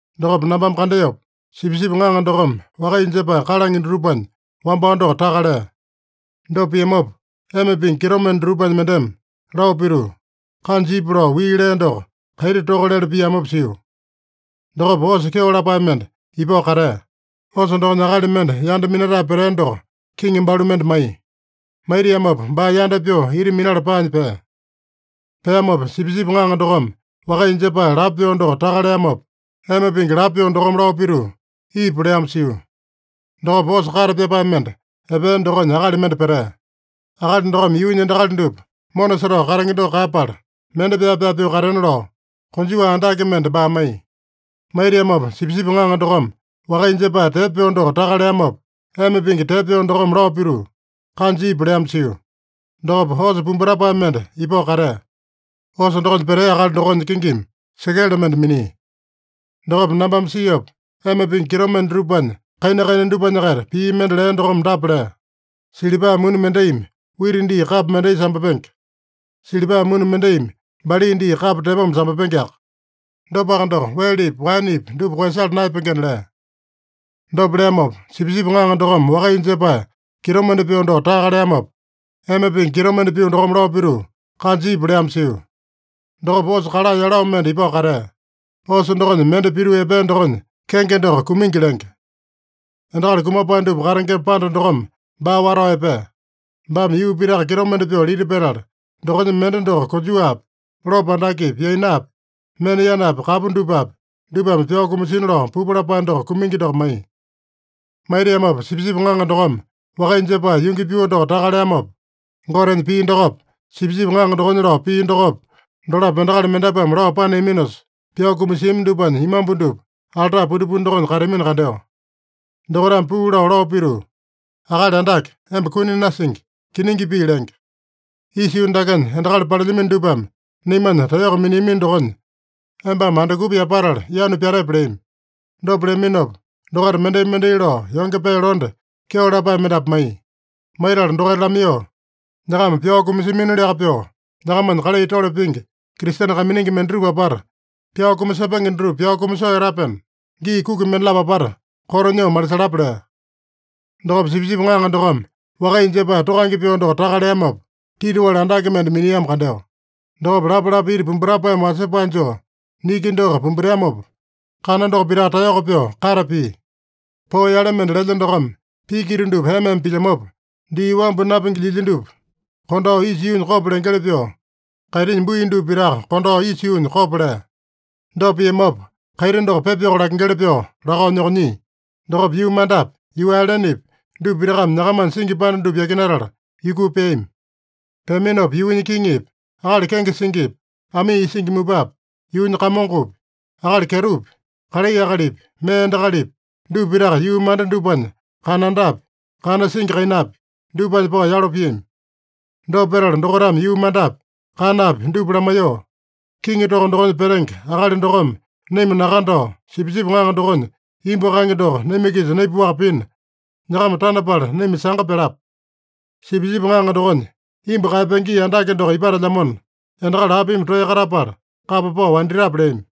Dokopa nambame kandeopa, Sipisipi Ŋaŋa dokome wakaiya jepae kalange dutupanya wambao doko taka lea. Dopa piamopa, ema pingi kitomende dutupanya mendeme lao pituu, “Kanja ipu” lao wii lea doko kaiti toka lele piamopa sio. Dokopa osa kyeo lapae mende ipao katea. Osa dokonya akali mende yanda minatae petea doko kiŋi balu mende maiya. Maitiamopa baa yanda pyoo ita minala paanya pea. Peamopa, Sipisipi Ŋaŋa dokome wakaiya jepae lapo pyoo doko taka leamopa, ema pingi lapo pyoo dokome lao pituu, “Ipu” leamo sio. Dokopa osa kate pyapae mende epea dokonya akali mende petea. Akali dokome yuunya endakali dupa mona setao katenge doko kaeyapala, mende pyaa-pyaa pyoo katena lao, konjuwa andake mende baa maiya. Maitiamopa, Sipisipi Ŋaŋa dokome wakaiya jepae tepo pyoo doko taka leamopa, ema pingi tepo pyoo dokome lao pituu, “Kanja ipu” leamo sio. Dokopa osa pumbutapae mende ipao katea. Osa dokonya petea akali dokonya kingimi sekele mende minia. Dokopa nambame siopa, ema pingi kitomende dutupanya kaina-kaina dupanya-kaita pii mende lea dokome dapa lea: “Silipa muni mendaimi wita dii kapo mendai sambapenge. Silipa muni mendaimi bali dii kapo tepoma sambapengeaka. Dopaka doko, welepi, waenepi dupa koeyasala naeyapengena” lea. Dopa leamopa, Sipisipi Ŋaŋa dokome wakaiya jepae kitomende pyoo doko taka leamopa, ema pingi kitomende pyoo dokome lao pituu, “Kanja ipu” leamo sio. Dokopa osa kala yelo mende ipao katea. Osa dokonya mende pituu epea dokonya kenge doko Kumingi lenge. Endakali kumapae dupa katengema panda dokome baa watao epea. Baame yuu pitaka kitomende pyoo lita petala, dokonya mende doko konjuwapi, lopo andakepi, yainapi, mena yanapi kapu dupapi, dupame pyao kumasina lao pupu lapae doko Kumingi doko maiya. Maitiamopa, Sipisipi Ŋaŋa dokome wakaiya jepae yungi pyoo doko taka leamopa, Gotenya pii dokopa, Sipisipi Ŋaŋa dokonya lao pii dokopa, dolapo endakali mendapuame lao paneaminosa pyao kumasiami dupanya imambu dupa alta pundipundi dokonya kateamino kandeo. Dokaitame puu lao, lao pituu, “Akali Andake, emba kuni nasingi, kiningi pii lenge. Isa yuu dakenya endakali palelyamino dupame naimanya taeyoko miniamino dokonya embame andukupa yapatala yanu pyatepe?” leami. Dopa leaminopa, dokaita mendai-mendai lao yonge pee londe, kyeo lapae mendapu maiya. Maitala dokaita lamaiyoo, “Nyakama pyao kumasiaminoliaka pyoo, nyakamanya kalai tole pingi, Kristene kaiminingi mendatupa apata pyao kumasepenge dutupa pyao kumasoo etapena, gii kuki mendalapo apata koto nyoo malisalapa” lea. Dokopa Sipisipi Ŋaŋa dokome wakaiya jepae tokange pyoo doko taka leamopa, titiwali andake mende miniamo kandeo. Dokopa lapalapa iti pumbutapaeme wasepae joo niki doko pumbuteamopa, kana doko pitaka taeyoko pyoo kate pia. Poo yale mende lelya dokome piki ita dupa ema-ema pilyamopa, dii wambu napingi lyilya dupa kondao isa yuunya kopo lengeli pyoo, kaitinya bui dupa pitaka kondao isa yuunya kopo lea. Dopa piamopa, kaiti doko pepa yoko lakengeli pyoo lakao nyokonyia. Dokopa yuu mandapi, yuu ailenepi, dupa pitakame nyakamanya singi panda dupa yakinatala yukuu peami. Peaminopa yuunya kiŋipi, akali kenge singipi, amii isingi mupapi, yuunya kamongopi, akali kyetopi, kalai akalipi, mee endakalipi, dupa pitaka yuu manda dupanya kanandapi, kana singi kainapi, dupanya pao yalo piami. Dopa petala dokaitame yuu mandapi, kanapi dupa lamaiyoo, “Kiŋi toko dokonya petenge akali dokome naima nakandao, Sipisipi Ŋaŋa dokonya imbu kaenge doko naima-kisa naipaowaka pina, nyakama tanapala naima sanga pyalapa. Sipisipi Ŋaŋa dokonya imbu kaeyapenge gii andake doko ipatelyamona, endakali apimi toeya katapala kapa pao wanditape?” leami.